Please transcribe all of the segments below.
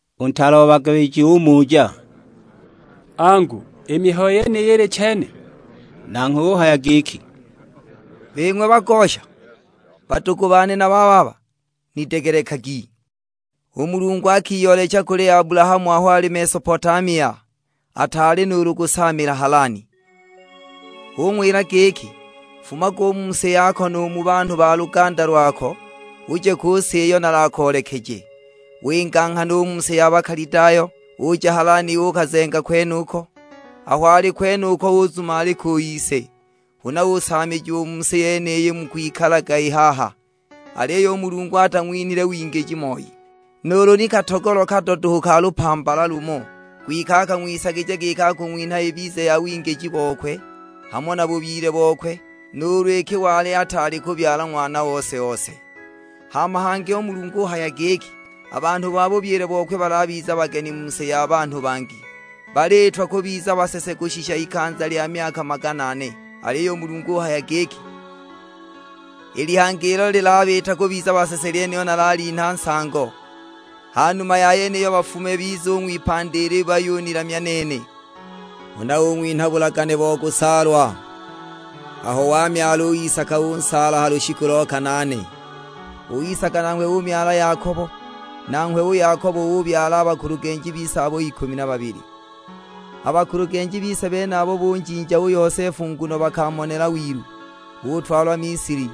U ntaale o bagabiji umuja, "Angu, i mihayo yeniyi ili chene?" Nanghwe uhaya giki, "Bing'we bagosha, badugu bane na bababa, nidegelekagi! U Mulungu akiyoolecha kuli Abulahamu aho ali Mesopotamia, ataali nuulu kusaamila Halani. Ung'wila giki, 'Fumaga u mu si yako nu mu banhu ba luganda lwako; uje ku si iyo nalakoolekeje.' Winga nghana u mu si ya Bakalidayo, uja Halani uukazenga kwenuko. Aho ali kwenuko uzumalika u ise, huna usaamijiwa u mu si yeniyi mukwikalaga i haha. Aliyo u Mulungu atang'winhile wingiji moi, nuulu ni katogolo kado duhu ka lupambala lumo. Kwike akang'wisagija giki akung'winha ibize ya wingiji bokwe, hamo na bubyile bokwe, nuulu iki wali ataali kubyala ng'wana ose-ose. Hama hangi u Mulungu uhaya giki, a banhu ba bubyile bokwe balabiza bageni mu si ya banhu bangi, baliitwa kubiza basese kushisha ikanza lya myaka magana ane. Aliyo u Mulungu uhaya giki, 'I lihanga ilo lilabiita kubiza basese lyenilo nalalinha nsango, ha numa ya yeniyo bafume bize u ng'wipandi ili bayunilamya nene.' Huna ung'winha bulagane bo kusaalwa; aho wamyala u Isaka unsaala ha lushiku lo kanaane. U Isaka nanghwe umyala Yakobo, nanghwe u Yakobo ubabyala a bakulugenji bise abo ikumi na babili. "A bakulugenji bise benabo bunjinja u Yosefu nguno bakamonela wilu; utwalwa Misili.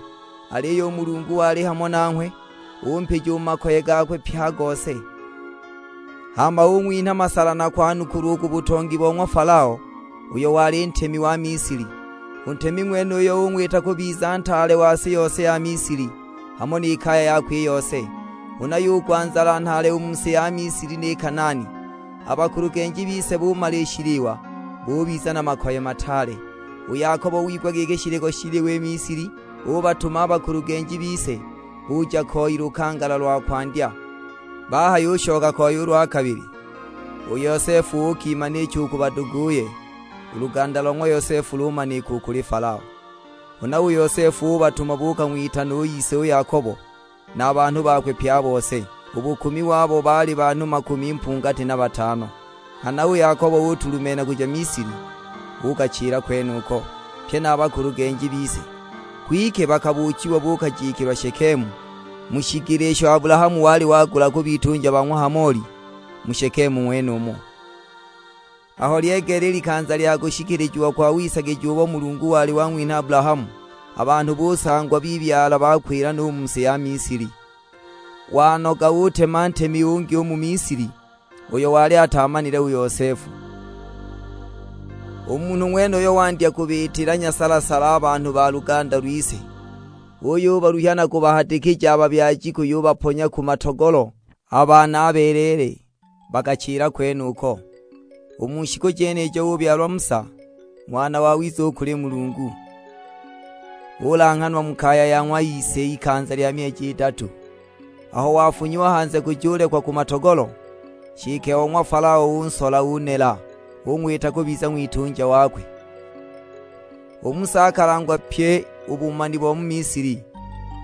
Aliyo u Mulungu wali hamo nanghwe. Umpija u mu makoye gakwe pye a gose, hama ung'winha masala na kwanukulwa u ku butongi bo ng'wa Falao, uyo wali ntemi wa Misili. U ntemi ng'wenuyo ung'wita kubiza ntaale wa si yose ya Misili, hamo ni kaya yakwe i yose. Huna yugwa nzala nhaale u mu si ya Misili ni Kanaani; a bakulugenji bise bumala i shiliwa, bubiza na makoye mataale. U Yakobo wigwa giki shiliko shiliwa i Misili, ubatuma a bakulugenji bise, buja koi lukangala lwa kwandya. Bahayushoka koi u lwa kabili, u Yosefu uukimanicha u ku baduguye; u luganda lo ng'wa Yosefu lumanika u kuli Falao. Huna u Yosefu ubatuma buukang'witana u ise u Yakobo, na a banhu bakwe pye a bose; u bukumi wabo baali banhu makumi mpungati na batano. Nghana u Yakobo utulumenha kuja Misili; uukachila kwenuko, pye na a bakulugenji bise. Kwike bakabuuchiwa buukajikilwa Shekemu, mu shigila isho Abulahamu wali wagula ku bitunja ba ng'wa Hamoli, mu Shekemu ng'wenumo." "Aho lyegeela i likanza lya kushikilijiwa kwa wisagija ubo Mulungu wali wang'winha Abulahamu, a banhu busangwa bibyala bakwila no u mu si ya Misili. Wanoga utema ntemi ungi u mu Misili, uyo wali ataamanile u Yosefu. U munhu ng'wenuyo wandya kubiitila nyasala-sala a banhu ba luganda lwise, uyubaluhya na kubahadikija a babyaji kuyubaponya ku matogolo a baana a beleele, baachila kwenuko. U mu shiku jenijo ubyalwa Musa; ng'wana wawiza u kuli Mulungu, ulanghanwa mu kaya ya ng'wa ise ikanza lya myeji idatu. Aho wafunyiwa hanze kujulekwa ku matogolo, nshike o ng'wa Falao unsola unela, ung'wita kubiza ng'witunja wakwe. U Musa akalangwa pyi u bumani bo mu Misili,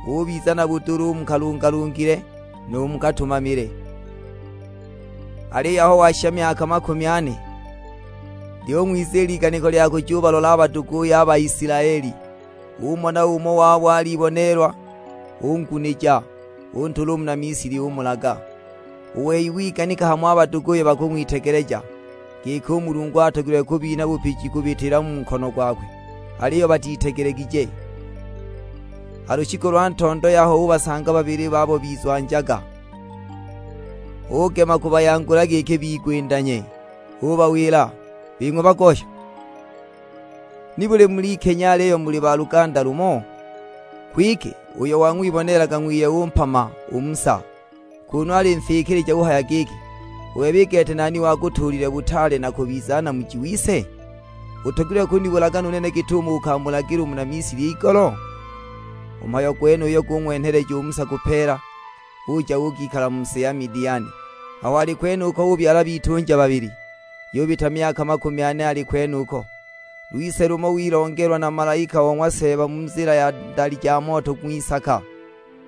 ubiza na budula u mu kalungalungile, nu mu katumamile." "Aliyo aho washisha myaka makumi ane, lyung'wiziila iganiko lya kujubalola a baduguye a Baisilaeli. Umona umo wabo aliboneelwa, ungunija; untula u muna Misili umulaga. U wei wiganikaga hamo a baduguye bakwitegeleja, giki u Mulungu atogilwe kubinha bupiji kubitila mu nkono gokwe, aliyo batitegelegije. Ha lushiku lwa ntondo yaho ubasanga babili babo bizwanjaga, ugema kubayangula giki bigwindanye; ubawila, 'Bing'we bagosha, nibuli mulikenya aliyo muli ba ludugu lumo?' Kwike uyo wang'wiboneelaga ng'wiye umpama u Musa, kunu alinfikilija uhaya giki, 'U bebe i gete nani wakutuulile butaale na kubiza namuji wise? Utogilwe kunibulaga nu nene git'umo ukamulagila muna Misili igolo?' U mhayo gwenuyo gung'wenheleja u Musa kupeela, uja uukikala mu si ya Midiani; aho ali kwenuko ubyala bitunja babili. Yubita myaka makumi ane ali kwenuko, lwise lumo wilongelwa na malaika o ng'wa Seeba mu nzila ya ndali ja moto ng'wisaka,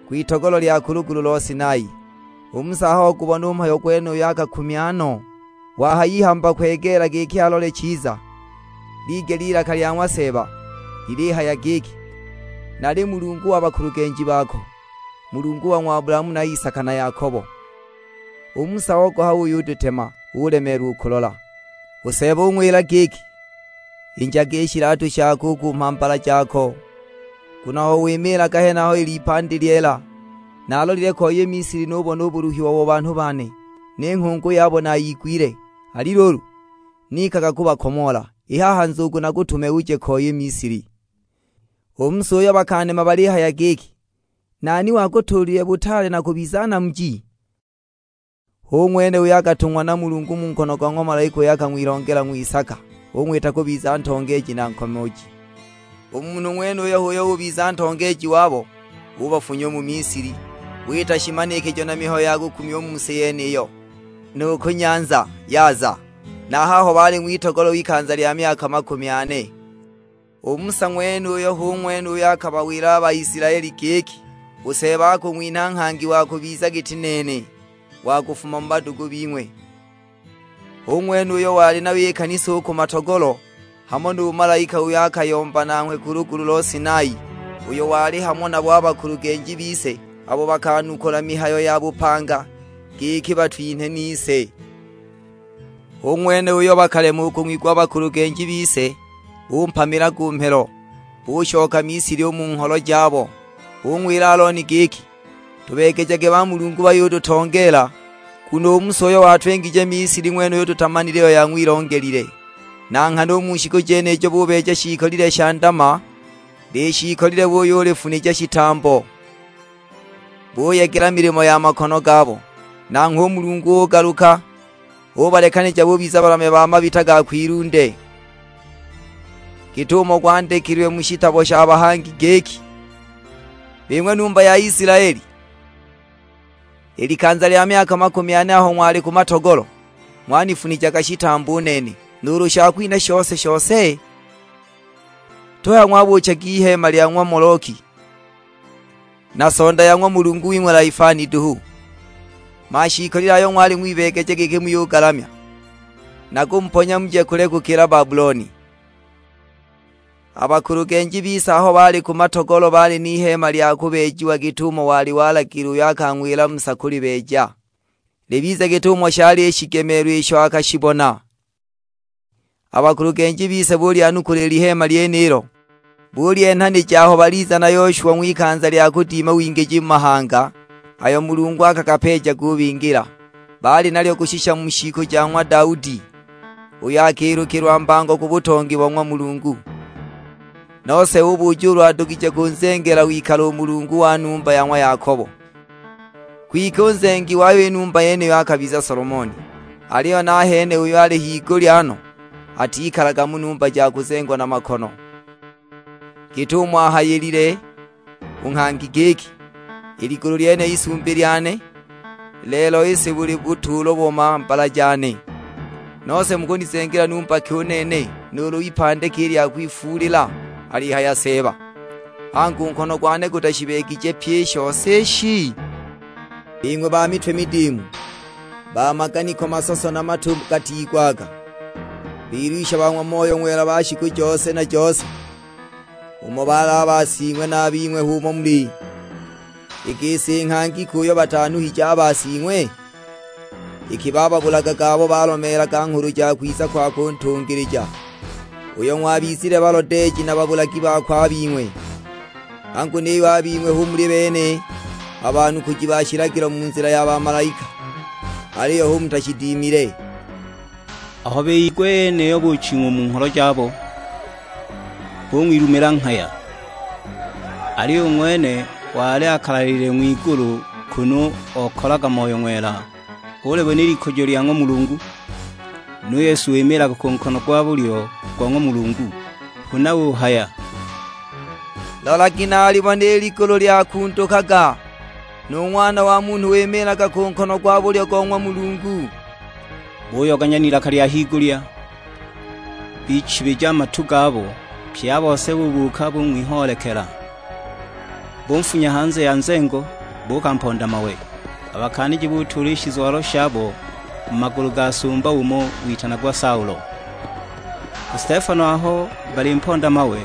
kwitogolo lya ku lugulu lo Sinai. U Musa aho ogubona u mhayo gwenuyo akakumya no; wahayihamba kwegeela giki alole chiza, ligela ilaka lya ng'wa Seeba, lilihaya giki, 'Nali Mulungu wa bakulugenji bako, Mulungu wa ng'wa Abulahamu na Isaka na Yakobo.' U Musa ogoha uyudetema, ulemeelwa u kulola. U Seeba ung'wila giki, 'Injaga i shilatu shako u ku mhambala jako, nguno aho wimiilaga henaha lil'ipandi lyeela. Naalolile ko i Misili nububona u buluhiwa wa banhu bane, ni nghungu yabo nayigwile. Ali luulu, nikaga kubakomoola, i haha nzugu nakutume uje ko i Misili.' "U Musa uyo bakanema balihaya giki, 'Nani wakutuulile butaale na kubiza namuji?' hu ng'wene uyo akatung'wa na Mulungu mu nkono go ng'wa malaika uyo akang'wilongela ng'wisaka, ung'wita kubiza ntongeeji na nkomooji. U munhu ng'wenuyu h'uyo ubiza ntongeeji wabo, ubafunya u mu Misili; wita shimanikijo na mihayo ya kukumya u mu si yeniyo, nu ku Nyanza Yaza, na haho bali ng'witogolo ikanza lya myaka makumi ane. U Musa ng'wenuyu hu ng'wene uyo akabawila a Baisilaeli giki, 'U Seeba akung'winha nghangi wa kubiza giti nene, wa kufuma mu badugu bing'we.' Hu ng'wene uyo wali nayo i kanisa u ku matogolo, hamo nu malaika uyo akayomba nanghwe ku lugulu lo Sinai, uyo wali hamo nabo a bakulugenji bise abo bakanukula mihayo ya bupanga; giki batwinhe nise. "Hu ng'wene uyo bakalema u kung'wigwa a bakulugenji bise; bumpamila ku mhelo, bushoka Misili u mu ngholo jabo. Bung'wila Alooni giki, 'Tubeegejage bamulungu bayututongeela, nguno u Musa uyo watwingije Misili ng'wenuyu tutamanile iyo yang'wilongelile.' Na nghana u mu shiku jenijo bubeeja shiikolile sha ndama; lishiikolile buyulifunija shitambo, buyegela milimo ya makono gabo! Nanghwe u Mulungu ugaluka, ubalekanija bubiza balamya ba mabita ga kwilunde, git'umo gwandikilwe mu shitabo sha bahangi; giki, 'Bing'we numba ya Isilaeli, i likanza lya myaka makumi ane aho ng'wali ku matogolo, ng'wanifunijaga shitambo u nene, nuulu shakwinha shose-shose? Tuhaya ng'wabuuchaga iheema lya ng'wa Moloki, na sonda ya ng'wa mulungu wing'we Laifani duhu, mashiikolile ayo ng'wali ng'wibeegeja giki muyugalamya! Nakumuponya muje kule gukila Babuloni!' "A bakulugenji bise aho bali ku matogolo baali n'iheema lya kubeejiwa git'umo wali walagiilila uyo akang'wila Musa kulibeeja, libize git'umo shaali i shigemelo isho akashibona. A bakulugenji bise bulyanukula i liheema lyenilo, bulyenhanija aho baliza na Yoshwa ng'wikanza lya kudima wingiji mu mahanga, ayo Mulungu akagapeeja gubingila. Baali nalyo kushisha mu shiku ja ng'wa Daudi, uyo akilukilwa mbango ku butongi bo ng'wa Mulungu. Nose ubuja ulu adugije kunzengela wikalo u Mulungu wa numba ya ng'wa Yakobo. Kwike u nzengi wayo i numba yeniyo akabiza Solomoni. Aliyo nahene uyo ali higulya no, atikalaga mu numba ja kuzengwa na makono; git'umo ahayilile u nghangi giki, 'I ligulu lyene isumbi lyane, lelo i si buli butuulo bo mhambala jane; nose mukunizengela numba ki u nene, nuulu ipandi ki lya kwifuulila? Alihaya Seeba! Angu, u nkono gwane gutashibeegije pyi i shose ishi?' "Bing'we ba mitwe midiimu, ba maganiko masoso na matu gatigwaga, bilwisha ba ng'wa Moyo Ng'wela ba shiku jose na jose! Umo baali a basing'we na a bing'we h'umo muli. I gisi nghangi ki uyo batanuhije a basing'we? Iki bababulagaga abo balomeelaga nghulu ja kwiza kwakwe u Ntungilija, uyo ng'wabizile balodeeji na babulagi bakwe a bing'we! Angu niyo a bing'we hu muli bene a banukuji ba shilagilo mu nzila ya bamalaika, aliyo hu mutashidimile!" Aho biyigwa i yeniyo buching'wa u mu ngholo jabo, bung'wilumila nghaya. Aliyo u ng'wene wali akalalilile ng'wigulu kunu okalaga Moyo Ng'wela, ulibona i likujo lya ng'wa Mulungu, nu Yesu wimiilaga ku nkono gwa bulyo go ng'wa Mulungu. Huna uhaya, "Lolagi nalilibona i ligulu lyakundukaga, nu Ng'wana wa Munhu wimiilaga ku nkono gwa bulyo go ng'wa Mulungu." Buyoganya n'ilaka lya higulya, bichibija a matu gabo; pye a bose bubuuka bung'wihoolekela. Bunfunya hanze ya nzengo buukamponda mawe. A bakaaniji butuula i shizwalo shabo mu magulu ga sumba umo witanagwa Saulo. U Stefano aho balimponda mawe,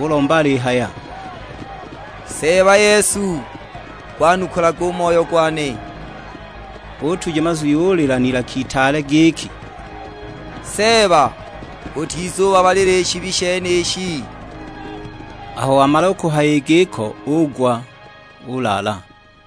ulomba alihaya, "Seeba Yesu, gwanukulage u moyo gwane." Utuja mazwi ulila n'ilaka itaale giki, "Seeba utizubabalila i shibi shenishi." Aho wamala u kuhaya i giko ugwa, ulaala!